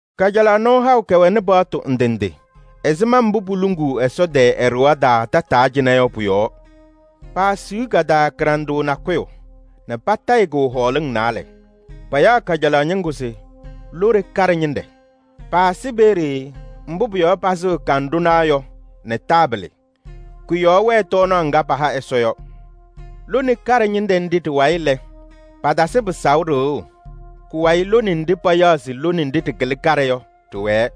Kajalaɣ nɔɔ haʋ kɛwɛnɩ paɣtʋ ndɩ ndɩ ɛzɩma mbʋ poluŋuu Ɛsɔ tɛɛ ɛ-ɖɩɣa taa tataa cɩnɛ yɔ pʋ-yɔɔ. Paasiɣ ka-taa kɩɖanɖʋʋ nakʋyʋ nɛ patayɩ-kʋ hɔɔlɩŋ naalɛ: payaɣ kajalaɣ ñɩŋgʋ se lone kaɖɛ ñɩnɖɛ. Paasɩ peeye mbʋ pʋ-yɔɔ pasɩɣ kanɖʋnaa yɔ nɛ taabɩlɩ. Kʋ-yɔɔ wɛ tɔɔnaɣ ŋga paha Ɛsɔ yɔ. Lone kaɖɛ ñɩnɖɛ nɖɩ ɖɩ-wayɩ lɛ, patasɩ pɩsaʋ ɖɩɣʋ. Kʋ-wayɩ lone nɖɩ payaɣ se lone nɖɩ ɖɩkɩlɩ kaɖɛ yɔ ɖɩwɛɛ.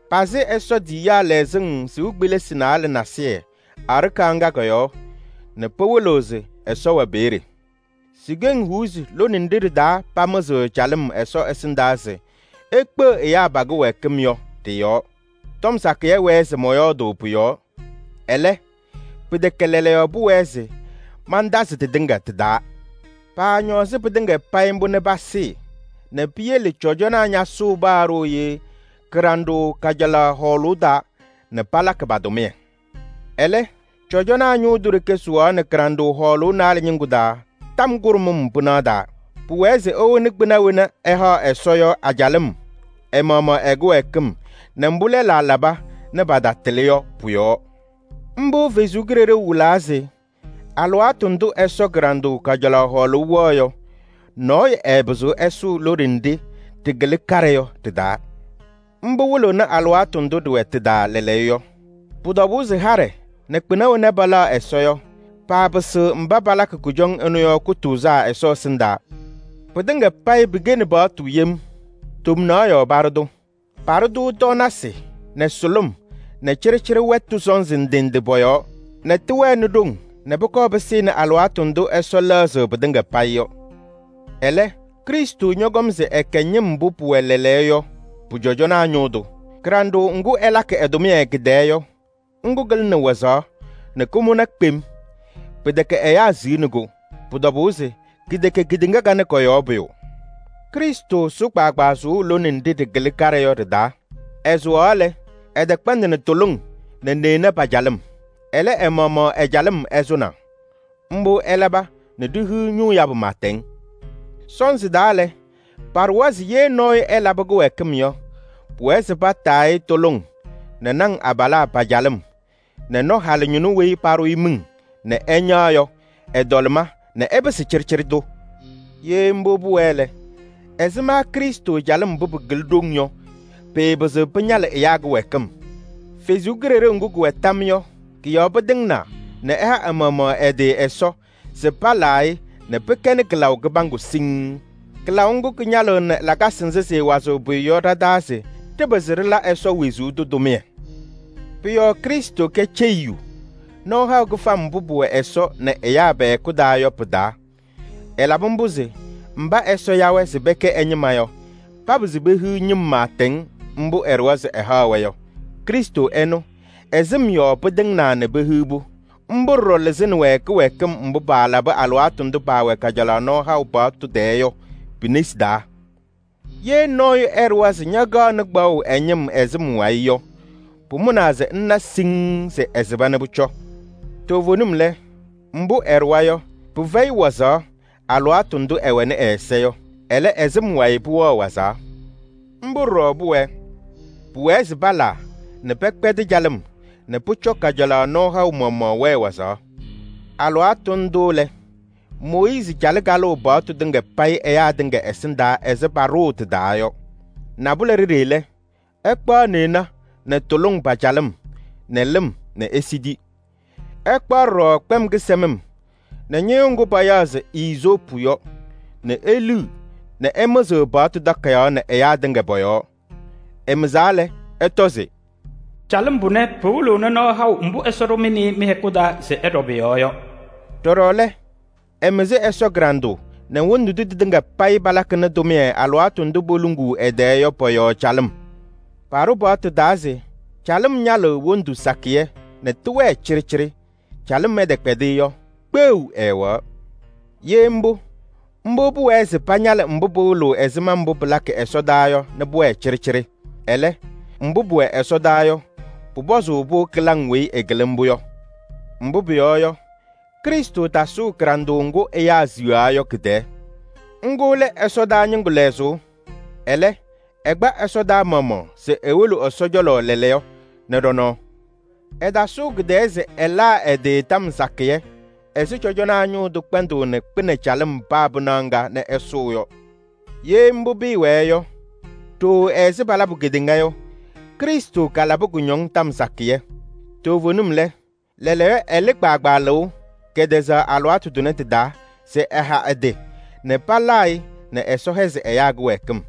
Pasɩ Ɛsɔ tiyiyaa lɛzɩŋ sɩʋ kpelisi naalɛ nasɩyɩ aɖakaɣ ŋga kɔ-yɔɔ nɛ pɩwɩlɩɣ se Ɛsɔ wɛ peeye. Si-keŋ huuzi lone nɖɩ ɖɩ-taa pamɩzɩɣ calɩm Ɛsɔ ɛsɩndaa se ekpeɣ ɛyaa pa-kɩwɛɛkɩm yɔ, ɖɩ-yɔɔ. Tɔm sakɩyɛ wɛɛ se mɔyɔɔdʋʋ pʋ-yɔɔ, ɛlɛ, pɩtɛkɛ lɛɛlɛɛyɔ pʋwɛɛ se mantazɩ tɩtɩŋa tɩ-taa. Paañɔɔzɩ pɩtɩŋa payɩ mbʋ nɛ pasɩɩ nɛ piyele cɔjɔnaa ñasʋʋ paa kɩyakʋ ŋgʋ kɩɖanɖʋʋ kajalaɣ hɔɔlʋʋ taa se pala pa-tʋmɩyɛ. Ɛlɛ, cɔjɔnaa ñʋʋ tʋ ɖeke sʋwaɣnɩ kɩɖanɖʋʋ hɔɔlʋʋ naalɛ ñɩŋgʋ taa tɔm kʋɖʋm pɩnaɣ taa. Pʋwɛɛ se ewoni kpɩna wena ɛhaɣ Ɛsɔ yɔ a-calɩm ɛ-maɣmaɣ ɛ-kɩwɛɛkɩm nɛ mbʋ lɛlaa laba nɛ patatɩlɩ yɔ pʋ-yɔɔ. Mbʋ Ɛsɔ Kalɩzaɣ wɩlaa se: alɩwaatʋ ndʋ Ɛsɔ kɩɖanɖʋʋ kajalaɣ hɔɔlʋʋ wɛɣ yɔ, nɔɔyʋ ɛɛpɩzɩɣ ɛsʋʋ lone nɖɩ ɖɩkɩlɩ kaɖɛ yɔ ɖɩ-taa. Mbʋ wɩlɩɣnɩ alɩwaatʋ ndʋ ɖɩwɛ tɩ-taa lɛɛlɛɛyɔ yɔ. Pʋ-tɔbʋʋ se haɖɛ nɛ kpɩna wena palaɣ Ɛsɔ yɔ, paapɩsɩɣ mba palakɩ kʋjɔŋ ɩnʋ yɔ kʋtʋʋzaa Ɛsɔ ɛsɩndaa. Pɩtɩŋa payɩ pɩkɛnɩ paɣtʋ yem. Tomnaɣ yɔɔ paɖʋ-tʋ: paɖʋ-tʋ tɔɔnasɩ nɛ sʋlʋm nɛ cɩɖɩcɩɖɩ wɛtʋ sɔnzɩ ndɩ ndɩ pɔ-yɔɔ, nɛ tɩwɛnɩ ɖoŋ nɛ pʋkɔɔ pɩsɩnɩ alɩwaatʋ ndʋ Ɛsɔ lɛɣzɩ pɩtɩŋa payɩ yɔ. Ɛlɛ, Krɩstʋ ñɔkɔm se ɛkɛ ñɩm mbʋ pʋwɛ lɛɛlɛɛyɔ yɔ pʋ-cɔjɔnaa ñʋʋ tʋ. Kɩɖanɖʋʋ ŋgʋ ɛlakɩ ɛ-tʋmɩyɛ kɩ-tɛɛ yɔ, ŋgʋ kɩlɩnɩ wazaɣ nɛ kʋmʋna kpem. Pɩtɛkɛ ɛyaa siɣni-kʋ. Pʋ-tɔbʋʋ se kɩtɛkɛ kedeŋa kanɛ kɔ-yɔɔ pʋyʋ. Krɩstʋ sʋ kpaagbaa sʋʋ lone nɖɩ ɖɩkɩlɩ kaɖɛ yɔ ɖɩ-taa. Ɛsʋwaɣ lɛ, ɛtɛkpɛndɩnɩ tuluŋ nɛ neɣna pa-calɩm. Ɛlɛ, ɛ-maɣmaɣ ɛ-calɩm ɛsʋnaa. Mbʋ ɛlaba nɛ ɖihiɣ ñʋʋ yabʋ pɩɩtɛŋ. Sɔnzɩ taa lɛ, paɖʋwa se ye nɔɔyʋ ɛlabɩ kɩwɛɛkɩm yɔ, pʋwɛɛ se pataa-ɩ tuluŋ nɛ naŋ abalaa pa-calɩm nɛ nɔ halɩñɩnʋ weyi paɖʋ-ɩ miŋ nɛ ɛñaɣ yɔ ɛ-tɔlɩma nɛ ɛpɩsɩ cɩɖɩcɩɖɩ tʋ. Ye mbʋ pʋwɛɛ lɛ, ɛzɩma Krɩstʋ calɩm mbʋ pɩkɩlɩ ɖoŋ yɔ, pɩɩpɩzɩɣ pɩñalɩ ɛyaa kɩwɛɛkɩm! Kalɩzaɣ ŋga kɛwɛ tam yɔɔ yɔ, kɔ-yɔɔ pɩtɩŋnaa nɛ ɛha ɛ-maɣmaɣ ɛ-tɩ Ɛsɔ se palaa-ɩ nɛ pɩkɛnɩ kɩlaʋ kɩbaŋgʋ siŋŋ. Kɩlaʋ ŋgʋ kɩñalɩɣnɩ lakasɩ nzɩ sɩɩwazɩɣ pʋyʋ yɔ ɖa-taa se ɖɩpɩzɩ ɖɩla Ɛsɔ wezuu tʋ tʋmɩyɛ. Pʋ-yɔɔ Krɩstʋ kɛ ceyiyu nɔɔ haʋ kɩfam mbʋ pʋwɛ Ɛsɔ nɛ ɛyaa pɛ-hɛkʋ taa yɔ pɩ-taa. Ɛlabɩ mbʋ se mba Ɛsɔ ya-wɛ se pɛkɛ ɛ-ñɩma yɔ, papɩzɩ pehiɣ ñɩm pɩɩtɛŋ mbʋ ɛɖʋwa se ɛhaɣ-wɛ yɔ. Krɩstʋ ɛnʋ, ɛ-sɩm yɔɔ pɩtɩŋnaa nɛ pehiɣ-pʋ. Mbʋ ɖɔɖɔ lɩzɩnɩ-wɛ kɩwɛɛkɩm mbʋ paalabɩ alɩwaatʋ ndʋ paawɛ kajalaɣ nɔɔ haʋ paɣtʋ tɛɛ yɔ pi-nesi taa. Ye nɔɔyʋ ɛɖʋwa se ñakaɣnɩ kpaɣʋ ɛ-ñɩm ɛ-sɩm wayɩ yɔ, pʋmʋnaa se ŋna siŋŋ se ɛsɩba nɛ pʋcɔ. Toovenim lɛ, mbʋ ɛɖʋwa yɔ, pɩfɛyɩ wazaɣ alɩwaatʋ ndʋ ɛwɛnɩ ɛ-ɛza yɔ. Ɛlɛ, ɛ-sɩm wayɩ pʋwɛɣ wazaɣ. Mbʋ ɖɔɖɔ pʋwɛɛ: pʋwɛɛ se palaa nɛ pɛkpɛdɩ calɩm nɛ pʋcɔ kajalaɣ nɔɔ haʋ maɣmaɣ wɛɛ wazaɣ. Alɩwaatʋ ndʋ lɛ, Mooyiizi calɩ kalʋʋ paɣtʋ tɩŋa payɩ ɛyaa tɩŋa ɛsɩndaa ɛzɩ paɖʋʋ tɩ-taa yɔ. Nabʋlɛ ɖeɖe lɛ, ɛkpaɣ neɣna nɛ tuluŋ pa-calɩm nɛ lɩm nɛ esidi. Ɛkpaɣ ɖɔɖɔ kpɛm kɩsɛmɩm nɛ ñɩyʋʋ ŋgʋ payaɣ se iizoopu yɔ nɛ eliɣ nɛ ɛmɩzɩɣ paɣtʋ takayaɣ nɛ ɛyaa tɩŋa pɔ-yɔɔ. Ɛmɩzaa lɛ, ɛtɔ se: “Calɩm pʋnɛ pɩwɩlɩɣnɩ nɔɔ haʋ mbʋ Ɛsɔ ɖʋ mɩ nɛ ɩ mɩ-hɛkʋ taa se ɩɖɔ pʋ-yɔɔ yɔ.” Ɖɔɖɔ lɛ, ɛmɩzɩ Ɛsɔ kɩɖanɖʋʋ nɛ wondu ndʋ tɩtɩŋa payɩ palakɩnɩ tʋmɩyɛ alɩwaatʋ ndʋ poluŋuu ɛ-tɛɛ yɔ pɔ-yɔɔ calɩm. Paɖʋ paɣtʋ taa se calɩm ñalɩɣ wondu sakɩyɛ nɛ tɩwɛɛ cɩɖɩcɩɖɩ. Calɩm ɛtɛkpɛdɩ yɔ, kpeɣu ɛɛwɛɣ. Ye mbʋ, mbʋ pʋwɛɛ se pañalɩ mbʋ pɩwɩlɩɣ ɛzɩma mbʋ pɩlakɩ ɛsɔdaa yɔ nɛ pʋwɛɛ cɩɖɩcɩɖɩ. Ɛlɛ, mbʋ pʋwɛ ɛsɔdaa yɔ, pʋpɔzʋʋ-pʋ kɩlaŋ weyi ɩkɩlɩ mbʋ yɔ. Mbʋ pʋyɔɔ yɔ, Krɩstʋ tasʋʋ kɩɖanɖʋʋ ŋgʋ ɛyaa siɣaa yɔ kɩ-tɛɛ. Ŋgʋ lɛ ɛsɔdaa ñɩŋgʋ lɛzʋʋ. Ɛlɛ, ɛkpa ɛsɔdaa maɣmaɣ se ewolo Ɛsɔ cɔlɔ lɛɛlɛɛyɔ nɛ ɖɔ-nɔɔ. Ɛtasʋʋ kɩ-tɛɛ se ɛlaa ɛ-tɩ tɔm sakɩyɛ ɛzɩ cɔjɔnaa ñʋʋ tʋ kpɛndʋʋnɩ kpɩnɛ calɩm paa pɩnaɣ ŋga nɛ ɛsʋʋ yɔ. Ye mbʋ pɩɩwɛɛ yɔ, ɖooo ɛzɩ palabʋ kedeŋa yɔ, Krɩstʋ kalabɩ kʋñɔŋ tɔm sakɩyɛ. Toovenim lɛ, lɛɛlɛɛyɔ ɛlɩ kpaagbaa lɩʋ kɛtɛzaɣ alɩwaatʋ tʋnɛ tɩ-taa se ɛha ɛ-tɩ nɛ palaa-ɩ nɛ Ɛsɔ hɛzɩ ɛyaa kɩwɛɛkɩm.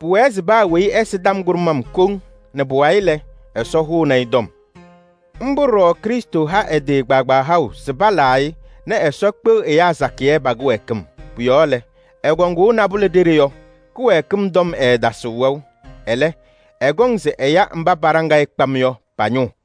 Pʋwɛɛ se paa weyi ɛsɩ tɔm kʋɖʋm koŋ nɛ pʋwayɩ lɛ, Ɛsɔ hʋnɩ-ɩ tɔm. Mbʋ ɖɔɖɔ Krɩstʋ ha ɛ-tɩ kpaagbaa haʋ se palaa-ɩ nɛ Ɛsɔ kpeɣ ɛyaa sakɩyɛ pa-kɩwɛɛkɩm. Pʋ-yɔɔ lɛ, ɛkɔŋʋʋ nabʋlɛ ɖeɖe yɔ, kɩwɛɛkɩm tɔm ɛɛtasɩɣ wɛʋ. Ɛlɛ, ɛkɔŋ se ɛya mba paɖaŋ-ɩ kpam yɔ pa-ñʋʋ.